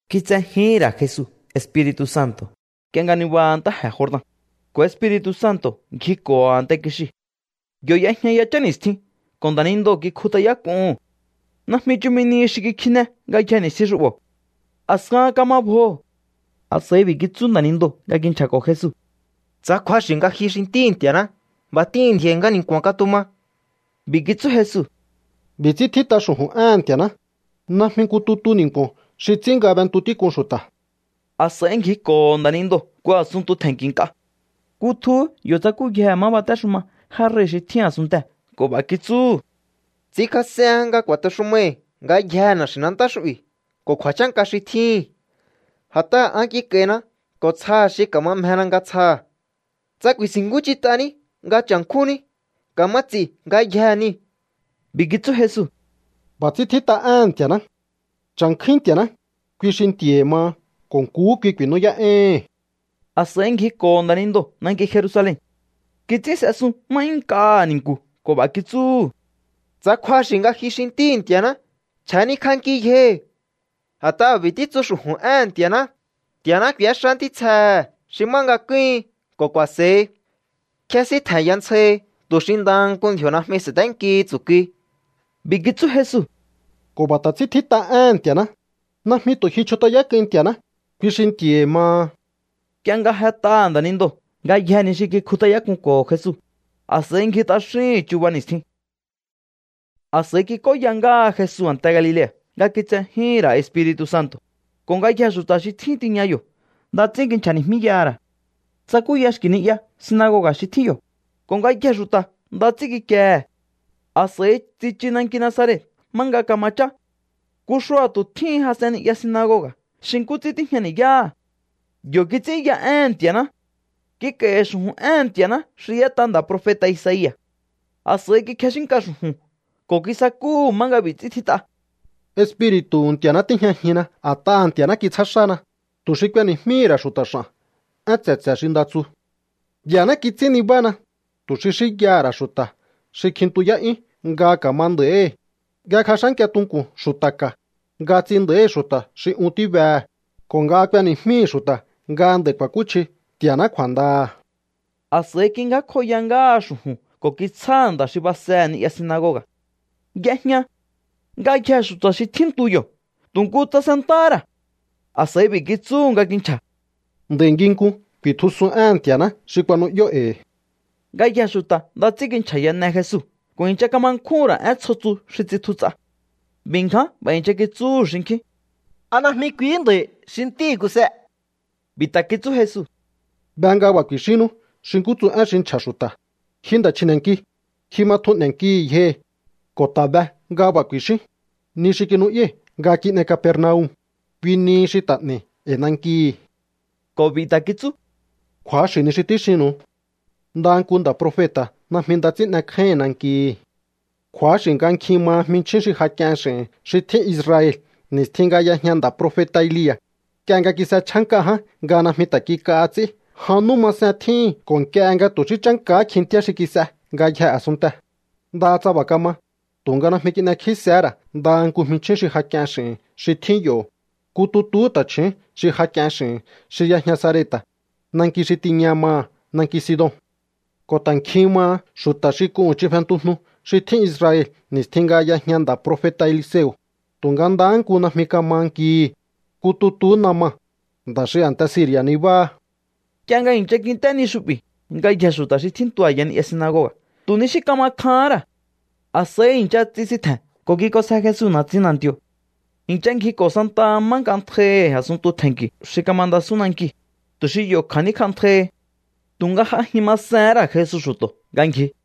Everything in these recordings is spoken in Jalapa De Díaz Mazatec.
Kitsejíhi̱n ra̱ Jesu Espiri̱tu̱ Santo̱ nk'ie nga nibaha ntáje̱ Jordan, ko̱ Espiri̱tu̱ Santo̱ ngjiko̱ho̱ a̱nte kixiu̱. Yo̱ y'ejña yachán ni̱stjin ko̱ nda̱nindoo̱ kikjut'ayák'uhu̱n. Najmi chumi nihi xi kikjine ngayjee̱ ni̱stjin xu'bo̱. A̱skahan kama bjoho̱. A̱s'a̱i b'i̱ kitsú nda̱nindoo̱ nga kinchja̱ko̱ Jesu: —Tsa kju̱axi̱ nga ji xi Ntíhi̱ Nti̱a̱ná, b'a̱ t'ihi̱n ndji̱o̱i̱ nga ni̱nku̱a̱n katuma. B'i̱ kitsú Jesu: —B'i̱ ts'ín tjít'a xu̱ju̱n éhe̱n Nti̱a̱ná: “Najmi nku tutu ni̱nku̱o̱n xi ts'ín nga b'entu tík'un xu̱ta̱.” A̱s'a̱i ngjiko̱ho̱ nda̱nindoo̱ nku a̱sunntu tje̱nki̱ nk'a. Kutjuhú yo̱ tsakúyjehe̱ má batéxuma já rei̱ xi tjín a̱sunntee̱ ko̱ b'a̱ kitsúhu̱: —Ts'inkjas'ehen nga ku̱a̱texumaihi̱ ngayjee̱ na̱xi̱nantá xu'bi̱ ko̱ kju̱a̱chánka xi tjíhi̱n. A̱t'aha̱ an kik'a̱i̱na ko̱ tsjaha̱ xi ka̱ma mjena nga tsjaha̱. Tsa ku̱i̱si̱nkúnch'int'aní nga cha̱nkjúnní, ka̱ma ts'i̱ ngayjee̱ niu̱. B'i̱ kitsú Jesu: —B'a̱ ts'ín tjít'a éhe̱n Nti̱a̱ná: “Cha̱nkjúín Nti̱a̱ná, kui xi Nti̱a̱hi̱ maha ko̱ nkuhú kui ku̱i̱nú'yá'éíhi̱n.” A̱s'a̱i ngjiko̱ho̱ nda̱nindoo̱ nanki Jerusalen. Kits'ín s'esun má 'yún nk'aha̱ ni̱nku̱ ko̱ b'a̱ kitsúhu̱: —Tsa kju̱axi̱ nga ji xi Ntíhi̱ Nti̱a̱ná, chja̱nikj'anki yjohi̱. A̱t'aha̱ b'a̱ títsu xu̱ju̱n éhe̱n Nti̱a̱ná: Nti̱a̱ná k'u̱éxá ntítsjehe̱ xi má nga kúhin ko̱ ku̱a̱se̱hi. Kjésíntje̱nya ntsjahi tu̱ xi ndaha nku ndji̱o̱ najmi sa̱ténkihi tsu̱kui. B'i̱ kitsú Jesu: —Ko̱ b'a̱ ta̱ ts'ín tjít'a éhe̱n Nti̱a̱ná: “Najmi tu̱ ji chjut'ayák'uin Nti̱a̱ná, kui xi Nti̱a̱hi̱ maha.” Nk'ie nga jet'aha̱ nda̱nindoo̱ ngayjee̱ ni xi kikjut'ayák'unko̱ho̱ Jesu, a̱s'a̱i ngji t'axíhi̱n chuba ni̱stjin. A̱s'a̱i kik'óya ngáha Jesu a̱nte Galilea̱ nga kitsejíhi̱n ra̱ Espiri̱tu̱ Santo̱, ko̱ ngayjee̱ xu̱ta̱ xi tjín tiña yo̱ nda ts'ín kinchja̱ni̱jmíyaha̱ ra̱. Tsakúya xki̱ ni'ya sinagoga̱ xi tjín yo̱, ko̱ ngayjee̱ xu̱ta̱ nda ts'ín kikiehe̱. A̱s'a̱i tsichu nanki Nazaret má nga kama chá. Nku xua̱tu̱ tjíhin jas'en ni'ya sinagoga̱ xi nkú ts'ín tíjña ni̱yáha̱. Yo̱ kits'ínya éhe̱n Nti̱a̱ná. Kik'a̱i̱hi̱ xu̱ju̱n éhe̱n Nti̱a̱ná xi y'ét'a nda̱ profeta̱ Isaia̱. A̱s'a̱i kikjexínka xu̱ju̱n ko̱ kisakúhu̱ má nga b'i̱ ts'ín tjít'a: Espiri̱tu̱hu̱ Nti̱a̱ná tíjñajinna a̱t'aha̱ Nti̱a̱ná kitsjá xána, tu̱ xi k'ueni̱jmíhi̱ ra̱ xu̱ta̱ x'a̱n én tse̱tse̱ xi nda tsu. Nti̱a̱ná kits'ín nibána, tu̱ xi xínyaha̱ ra̱ xu̱ta̱ xi kjintuyá'yún nga ka̱ma nda̱íhi̱, nga kjex'ánkia tunku̱n xu̱ta̱ ka̱, nga ts'in nda̱íhi̱ xu̱ta̱ xi un tíbehe̱, ko̱ nga k'ueni̱jmíhi̱ xu̱ta̱ nga nd'a̱i̱ ku̱a̱kúchji Nti̱a̱ná kju̱a̱ndaha̱. A̱s'a̱i kingjákjoya ngáha xu̱ju̱n ko̱ kitsjáha̱ nda̱ xi basehe̱ ni'ya sinagoga̱. Y'ejña. Ngayjee̱ xu̱ta̱ xi tjíntu yo̱ tu̱ nku tsasentáhá ra̱. A̱s'a̱i b'i̱ kitsú nga kinchja̱: —Nd'a̱i̱ nginkun kuitjusun éhe̱n Nti̱a̱ná xi kuanu'yó e̱i̱. Ngayjee̱ xu̱ta̱ nda ts'ín kinchja̱yane Jesu ko̱ i̱ncha kama nkjúhu̱n ra̱ én tsjo tsu xi tsitju ts'a. B'i̱ ngján b'a̱ i̱ncha kitsúhu̱ xinkjín: —¿A najmi kuihí nda̱i̱ xi ntíhi̱ Kuse? B'i̱ ta̱ kitsú Jesu: —Be nga b'a̱ ku̱i̱xínnú xi nkú tsu én xi nchja̱ xu̱ta̱: “Ji nda̱ chji̱ne̱nki, ji ma tjun n'e̱nkihi̱ yjohi̱”, ko̱ ta̱ be nga b'a̱ ku̱i̱xíún: “Ni xi kinu'yái̱ nga kin'ei Capernaum, kui nihi xi ta̱ n'e̱i̱ e̱i̱ nankihi̱.” Ko̱ b'i̱ ta̱ kitsú: —Kju̱axi̱ ni xi tíxinnu̱u. Ndaha nku nda̱ profeta̱ najmi nda ts'ín n'ekjáíhi̱n nankihi̱. Kju̱axi̱ nga nkjin maha jminchjín xi ja k'ien x'i̱hi̱n xi tjín Israel ni̱stjin nga y'ejña nda̱ profeta̱ Elia̱, nk'ie nga kis'echjá nk'a ján nga najmi ta̱ kik'aha ts'í jan nú masen tjíhin ko̱ nk'ie nga tu̱ xí chánkahá kjintíá xi kis'e ngayjee̱ a̱sunntee̱. Ndaha tsa b'a̱ kama, tu̱nga najmi kin'ekjísehé ra̱ ndaha nku jminchjín xi ja k'ien x'i̱hi̱n xi tjín yo̱, nku tutuhú ta̱chju̱ún xi ja k'ien x'i̱hi̱n xi y'ejña Sarepta̱, nanki xi tiña maha̱ nanki Sidon. Ko̱ ta̱ nkjin maha xu̱ta̱ xi k'uhu̱n ch'in fentujnu xi tjín Israel ni̱stjin nga y'ejña nda̱ profeta̱ Eliseo̱, tu̱nga ndahá nku najmi kama nkihi̱, nku tutuhú Naman, nda̱ xi a̱nte Siri̱a̱ nibáha. Nk'ie nga i̱ncha kint'é ni xu'bi̱, ngayjee̱ xu̱ta̱ xi tjíntu a̱ya ni'ya sinagoga̱ tu̱ ni xí kama kjahán ra̱. A̱s'a̱i i̱ncha tsisintje̱n ko̱ kik'onsje Jesu na̱tsin na̱nti̱o̱. I̱ncha ngjiko̱ santaha má nk'antjaihi̱ a̱sunntu tje̱nki̱ xi kamandasún nankiu̱, tu̱ xi yo̱ kja̱níkj'antjaihi. Tu̱nga j'ajin masehén ra̱ Jesu xu̱to̱ nga ngji.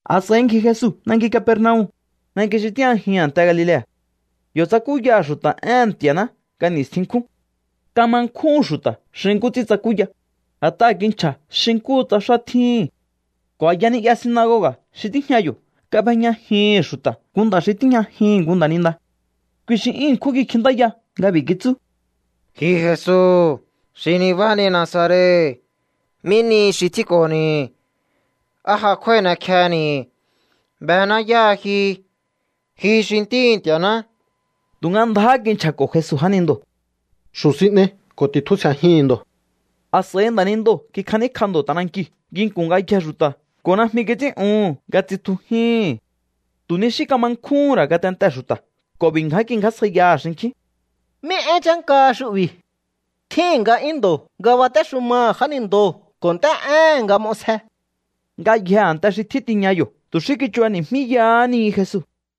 A̱s'a̱i ngji Jesu nanki Capernaum, nanki xi tíjñajihi̱n a̱nte Galilea̱. Yo̱ tsakúyaha̱ xu̱ta̱ éhe̱n Nti̱a̱ná nga ni̱stjin nkjún. Kama nkjúhu̱n xu̱ta̱ xi nkú ts'ín tsakúya, a̱t'aha̱ kinchja̱ xi nkúhu tsa xá tjíhi̱n. Ko̱ a̱ya ni'ya sinagoga̱ xi tíjña yo̱ kab'ejñajihi̱n xu̱ta̱ nku nda̱ xi tíjñajihi̱n nku nda̱ninda. Kui xi 'yún ṉkjún kikjintáya nga b'i̱ kitsú: —Ji Jesu xi nibáhani Nazaret, ¿mí nihi xi tjínko̱ni̱? ¿Á ja kjúái̱ n'ekjehe̱ni̱? Bená yáha ji. Ji xi ntíhi̱ Nti̱a̱ná. Tu̱nga ndjáhá kinchja̱ko̱ Jesu nda̱nindoo̱: —¡Xu̱ sin n'ei ko̱ ti̱tjusje̱jihi̱n ndo̱! A̱s'a̱i nda̱nindoo̱ kikjaníkj'a ndo̱ t'anankiu̱ nginku̱n ngayjee̱ xu̱ta̱ ko̱ najmi kits'ín'uhu̱n nga tsitjujíhi̱n. Tu̱ ni xí kama nkjúhún ra̱ ngatentee̱ xu̱ta̱ ko̱ b'i̱ ngján kingjásjaiyaha̱ xinkjín: —¿Mí én chánkaha xu'bi̱? Tjíhi̱n nga'yún ndo̱ nga batéxumaha̱ jánindoo̱ ko̱ nt'é'éhe̱n nga m'osje. Ngayjee̱ a̱nte xi tjín tiña yo̱ tu̱ xí kichubani̱jmíyahá ni Jesu.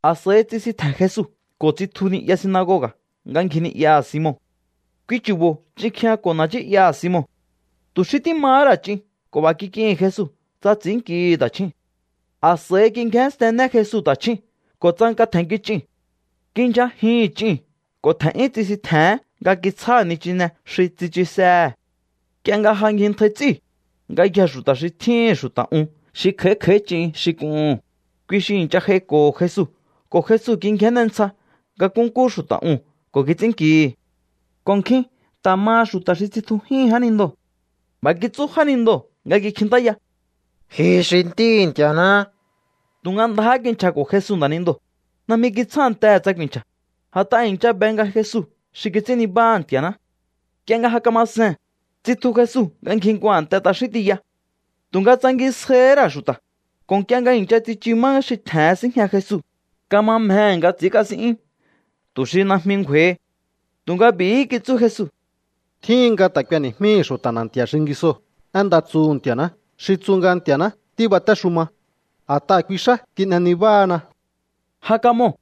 A̱s'a̱i tsisintje̱n Jesu ko̱ tsitju ni'ya sinagoga̱ nga ngji ni'yaha̱ Simon. Kui chu̱bo̱ ch'in kjijñako̱ na̱ nchí'yaha̱ Simon. Tu̱ xí tímahá ra̱ ch'in ko̱ b'a̱ kik'ihi̱n Jesu tsa ts'i̱ínnkihi̱ ta̱chjúu̱n. A̱s'a̱i kingjénstenne Jesu ta̱chjúu̱n ko̱ tsanka tje̱nnki ch'iu̱n. Kindyjajihi̱n ch'iu̱n ko̱ tje̱n'yún tsisintje̱hén nga kitsjáha̱ nichine xi tsichusehe̱. Nk'ie nga ja ngjintjai ts'íu̱, ngayjee̱ xu̱ta̱ xi tjíhi̱n xu̱ta̱ un xi kj'a̱í kj'a̱í ch'in xi k'uhu̱n, kui xi i̱ncha j'aiko̱ho̱ Jesu ko̱ Jesu kingjenne ntsja nga nkúnkú xu̱ta̱ uu̱n ko̱ kits'ínnkihi̱. Ko̱ nkjin ta̱ maha xu̱ta̱ xi tsitjujíhi̱n jánindoo̱. B'a̱ kitsú jánindoo̱ nga kikjintáya: —¡Ji xi Ntíhi̱ Nti̱a̱ná! Tu̱nga ndjáhá kinchja̱ko̱ Jesu jánindoo̱. Najmi kitsjántehe̱ tsa ku̱i̱nchja̱, a̱t'aha̱ i̱ncha be nga Jesu xi kits'ín nibáha̱ Nti̱a̱ná. Nk'ie nga ja kama see̱n, tsitju Jesu nga ngji nku a̱nte t'axín tiya. Tu̱nga tsangisjaihí ra̱ xu̱ta̱, ko̱ nk'ie nga i̱ncha tsichu má xi tje̱hen síjña Jesu, kama mjehe̱ nga ts'i̱ínkasín'yún tu̱ xi najmi ngju̱a̱i̱hi. Tu̱nga b'i̱hí kitsú Jesu: —Tjíhin nga ta̱ k'ueni̱jmíhi̱ xu̱ta̱ na̱nti̱a̱ xingisoo̱ én nda tsuhu̱ Nti̱a̱ná xi tsu nga Nti̱a̱ná tíbatéxuma. A̱t'aha̱ kui xá kin'e nibáhana. Ja kamoo̱,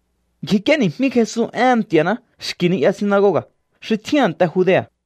ngjik'íéni̱jmí Jesu éhe̱n Nti̱a̱ná xki̱ ni'ya sinagoga̱ xi tjín a̱nte Judea̱.